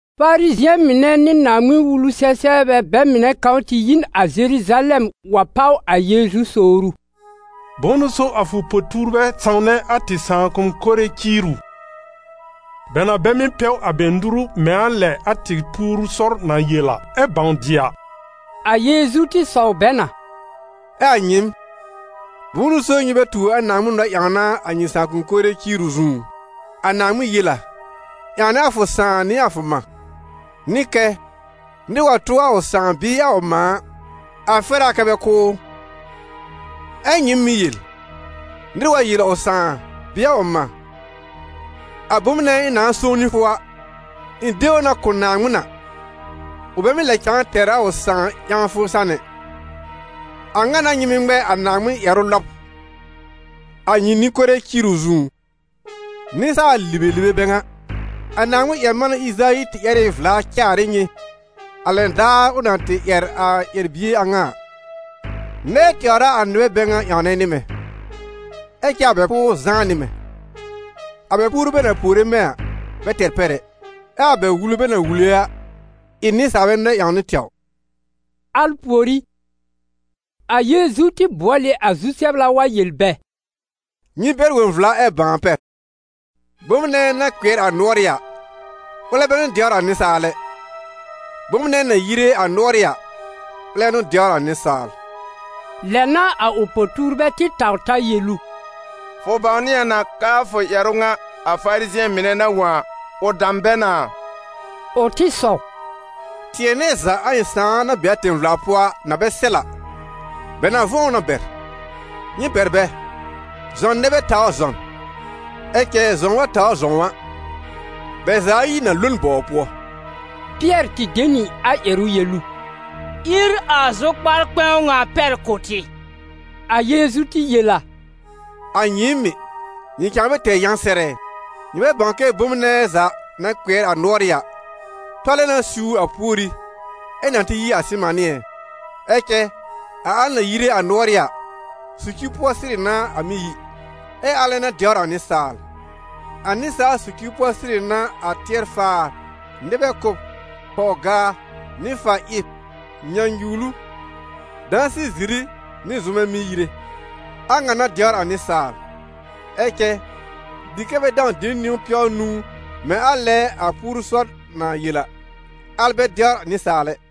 Farizɩ̃ɛ mɩnɛ nɩ Naaŋmɩn-Wulu-sɛ-sɛbrbɛ bɛ mɩnɛ kãw tɩ yi n a Zeruzalɛm wa pàw a Yeezu sowr ʋ: «Bʋ̃ʋ n'ʋ so a fʋ po-tuurbɛ sãwnɛ a tɩ sãakʋ̃-kore ciiru? Bɛ na bɛ mɩ́ pɛw a bɛ nuru mɛ̃ a lɛ a tɩ puoru sɔr na yel a, ɛ bãw dɩ a.» A Yeezu tɩ sɔw bɛ na: «Ɛ a nyɩɩm, bʋ̃ʋ n'ʋ so nyɩ bɛ tuur a Naaŋmɩn nɔ-ƴãwna a nyɩ sãakʋ̃-kore ciiru zũú? A Naaŋmɩn yel a: ‹Ƴãwnɛ a fʋ sãà nɩ a fʋ mã›, nɩ kɛ: ‹Nɩr wa tʋ ʋ sãà bɩɩ ʋ mã a, a fɛr a kɛ bɛ kʋ́ ʋ.› Ɛ nyɩɩm mɩ́ yel: ‹Nɩr wa yel ʋ sãà bɩɩ ʋ mã: a bom nɛ ɩ̃ nãá sõw nɩ fʋ a, ɩ̃ de ʋ na kʋ̀ Naaŋmɩn a›, ʋ bɛ mɩ́ lɛ cãa tɛr a ʋ sãà ƴãwfʋ san ɛ. A ŋa n'a nyɩ mɩ́ ŋmɛ a Naaŋmɩn ƴɛrʋ lɔb, a nyɩ nɩ-kore ciiru zũú. Nɩsaal-libelibe bɛ ŋa! A Naaŋmɩn-ƴɛr-manɛ Ɩzayi tɩ ƴɛr ɩ vla caar ɩ nyɩ, a lɛn daar ʋ na tɩ ƴɛr a ƴɛr-bie a ŋa a: ‹Nɛɛ tɛwr a a nɩbɛ bɛ ŋa ƴãwnɛ nɩ mɛ̃, ɛ cɛ a bɛ pʋʋr zãá nɩ mɛ̃. A bɛ puoru bɛ na puore mɛ̃ a, bɛ tɛr pɛr ɛ, ɛ a bɛ wulu bɛ na wule a, ɩ nɩsaalbɛ nɛ-ƴãwnɩ tɛwr.›» Al pùorí, a Yeezu tɩ bʋɔl ɩ a zu-sɛbla wa yel bɛ: «Nyɩ bɛr wõ vla, ɛ bãw a pɛr! Bom nɛ na kpɩɛr a nʋɔrɩ́ a, ʋlɛ bɛ n'ʋ dɛwr a nɩsaal ɛ; bom nɛ na yire a nʋɔrɩ́ a, ʋlɛ n'ʋ dɛwr a nɩsaal.» Lɛ n'a a ʋ po-tuurbɛ tɩ taw ta yel ʋ: «Fʋ bãwnɩ a na k'aa fʋ ƴɛrʋ ŋa a Farizɩ̃ɛ mɩnɛ na wõ a, ʋ dam bɛ na a?» Ʋ tɩ sɔw: «Tɩɛ nɛ za, a ɩ̃ Sãà na be a tẽ-vla pʋɔ a na bɛ sɛl a, bɛ na vʋ̃ɔ ʋ na bɛr. Nyɩ bɛr bɛ: zɔn nɛ bɛ tawr zɔn. Ɛ cɛ zɔ̃w wa tawr zɔ̃w a, bɛ za ayi na lo n bɔw pʋɔ.» Pɩɛr tɩ de nɩ a ƴɛrʋ yel ʋ: «Ír a zʋkpar-kpɛ̃w ŋa pɛr kʋ̀ tɩ.» A Yeezu tɩ yel a: «A nyɩɩm mɩ̀, nyɩ cãa bɛ tɛr yã sɛr ɛ? Nyɩ bɛ bãw kɛ bom nɛ za na kpɩɛr a nʋɔrɩ́ a, tɔlɛ na siwr a pùorì, ɛ na tɩ yi a sɩmanɩ́ ɛ? Ɛ cɛ a al na yire a nʋɔrɩ́ a, socir pʋɔ sɩrɩ n'a a mɩ́ yi, ɛ alɛ n'a dɛwr a nɩsaal. A nɩsaal socir pʋɔ sɩrɩ n'a a tɩɛr-faar, nɩbɛ kʋ́b, pɔw-gaa, nɩ-fa-ɩb, nyãnyuwlu, dãsɩ-ziri nɩ zʋmɛ mɩ́ yire. A ŋa n'a dɛwr a nɩsaal. Ɛ cɛ dɩ kɛ́ bɛ dãw de niwn pɛw nũu mɛ̃ a lɛ a puoru sɔr na yel a, al bɛ dɛwr nɩsaal ɛ.»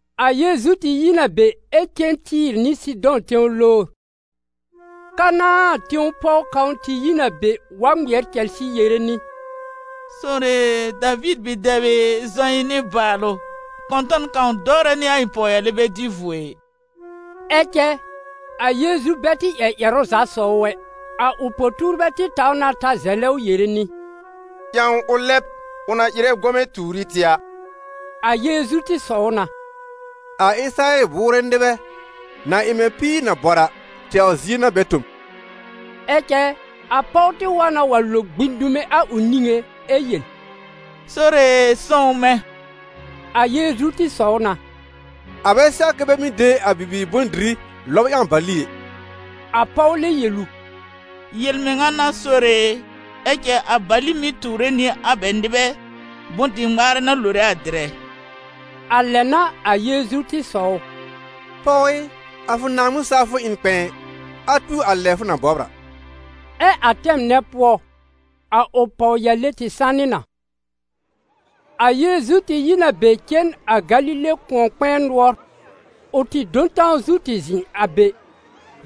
A Yeezu tɩ yi n a be ɛ cen Tɩ́ɩ̀r nɩ Sɩdɔ̃ tẽw lowr. Kanãa tẽw pɔw kãw tɩ yi n a be wa ŋmɩɛr cɛlsɩ yere nɩ: «Sore e, Daviir bi-dɛb ɩ, zɔ ɩ̃ nɩbaalʋ! Kɔ̃tɔn kãw dɔwrɛ nɩ a ɩ̃ pɔwyale bɛ dɩ vuo ɩ!» Ɛ cɛ a Yeezu bɛ tɩ ƴɛr ƴɛrʋ za sɔw ʋ ɛ. A ʋ po-tuurbɛ tɩ taw na ta zɛlɛ ʋ yere nɩ: «Ƴãw ʋ lɛb, ʋ na ɩrɛ gɔmɛ̃ tuur ɩ tɩ a.» A Yeezu tɩ sɔw na: «A Ɩsɩrayɛl bʋʋrɛ nɩbɛ, na ɩ mɛ̃ píir na bɔr a, tɛwr zie n'a bɛ tõ m.» Ɛ cɛ a pɔw tɩ wa na wa lo gbĩ dume a ʋ niŋé ɛ yel: «Sore e, sõw mɛ̃!» A Yeezu tɩ sɔw na: «A bɛ sɛw kɛ bɛ mɩ́ de a bibiir bʋ̃-dɩrɩ lɔb ƴãw bali ɛ.» A pɔw lɛb yel ʋ: «Yel-mɩŋa n'a, Sore e, ɛ cɛ a bali mɩ́ tuure nɩ a bɛ nɩbɛ bʋ̃-dɩ-ŋmaarɛ na lore a dɩrɛ.» A lɛ n'a a Yeezu tɩ sɔw ʋ: «Pɔw ɩ, a fʋ Naaŋmɩn-sawfʋ ɩ n kpɛ̃ɛ! A tu a lɛ fʋ na bɔbr a!» Ɛ a tɛm nɛ pʋɔ, a ʋ pɔwyale tɩ sanɩ na. A Yeezu tɩ yi n a be cen a Galile kʋ̃ɔ-kpɛ̃ɛ nʋɔr. Ʋ tɩ do n tãw zu tɩ zɩ̃ a be.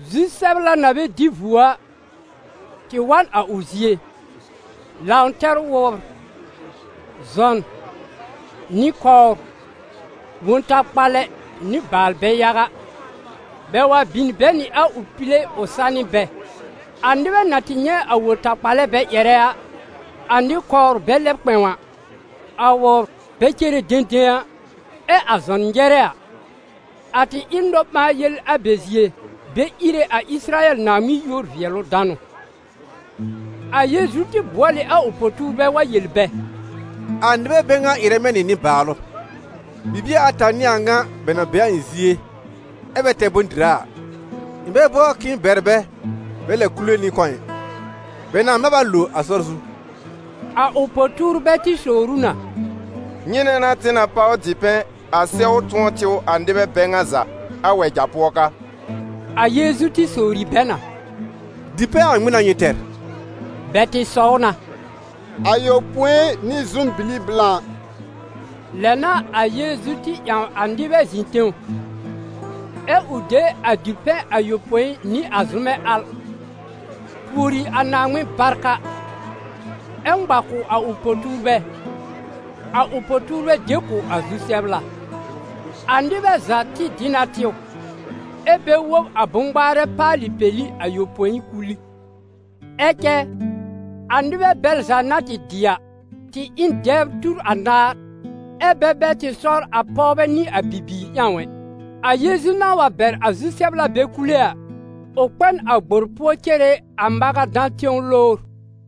Zu-sɛbla na bɛ dɩ vuo a, tɩ wa n a ʋ zie, lãw tɛr wʋbr, zɔn, nɩ-kɔwr, wõ-takpalɛ nɩ baalbɛ yaga. Bɛ wa bin bɛ nɩ a ʋ pile ʋ sanɩ bɛ. A nɩbɛ na tɩ nyɛ̃ a wõ-takpalɛ bɛ ƴɛrɛ a, a nɩ-kɔwr bɛ lɛb kpɛ̃w a, a wʋbr bɛ cere dẽdẽ a, ɛ a zɔn nyɛrɛ a, a tɩ ɩ nɔ-ɓãa-yel a bɛ zie, bɛ íre a Ɩsɩrayɛl Naaŋmɩn yúor-vɩɛlʋ-danʋ. A Yeezu tɩ bʋɔl ɩ a ʋ po-tuurbɛ wa yel bɛ: «A nɩbɛ bɛ ŋa ɩrɛ mɛ̃ nɩ nɩbaalʋ. Bibie ata n'ɩ a ŋa bɛ na be a ɩ̃ zie, ɛ bɛ tɛr bʋ̃-dɩra a. Ɩ̃ bɛ bɔr k'ɩ̃ɩ bɛr bɛ bɛ lɛb kule nɩ a kɔ̃ ɩ, bɛ nãá mab a lo a sɔr zu.» A ʋ po-tuurbɛ tɩ sowr ʋ na: «Nyɩnɛ n'a tɩ na páw dipɛ̃ a sɛw tʋ̃ɔ tɩw a nɩbɛ bɛ ŋa za, a wɛja pʋɔ ka?» A Yeezu tɩ sowri bɛ na: «Dipɛ̃ a ŋmɩn n'a nyɩ tɛr?» Bɛ tɩ sɔw na: «Ayopõi nɩ zʋm-bili blã.» Lɛ n'a a Yeezu tɩ ƴãw a nɩbɛ zɩ̃ tẽw, ɛ ʋ de a dipɛ̃ ayopõi nɩ a zʋ́mɛ al, pùori a Naaŋmɩn barka, ɛ ŋma kʋ̀ a ʋ po-tuurbɛ, a ʋ po-tuurbɛ de kʋ̀ a zu-sɛbla. A nɩbɛ za tɩ dɩ na tɩw, ɛ bɛ wob a bʋ̃-ŋmaarɛ paalɩ peli ayopõi kul ɩ. Ɛ cɛ, a nɩbɛ bɛl za na tɩ dɩ a, tɩ ɩ n dɛbr tur anaar, ɛ́ bɛ bɛ tɩ sɔr a pɔwbɛ nɩ a bibiir ƴãw ɛ. A Yeezu na wa bɛr a zu-sɛbla bɛ kule a, ʋ kpɛ n a gbor pʋɔ cere a Magadã tẽw lowr.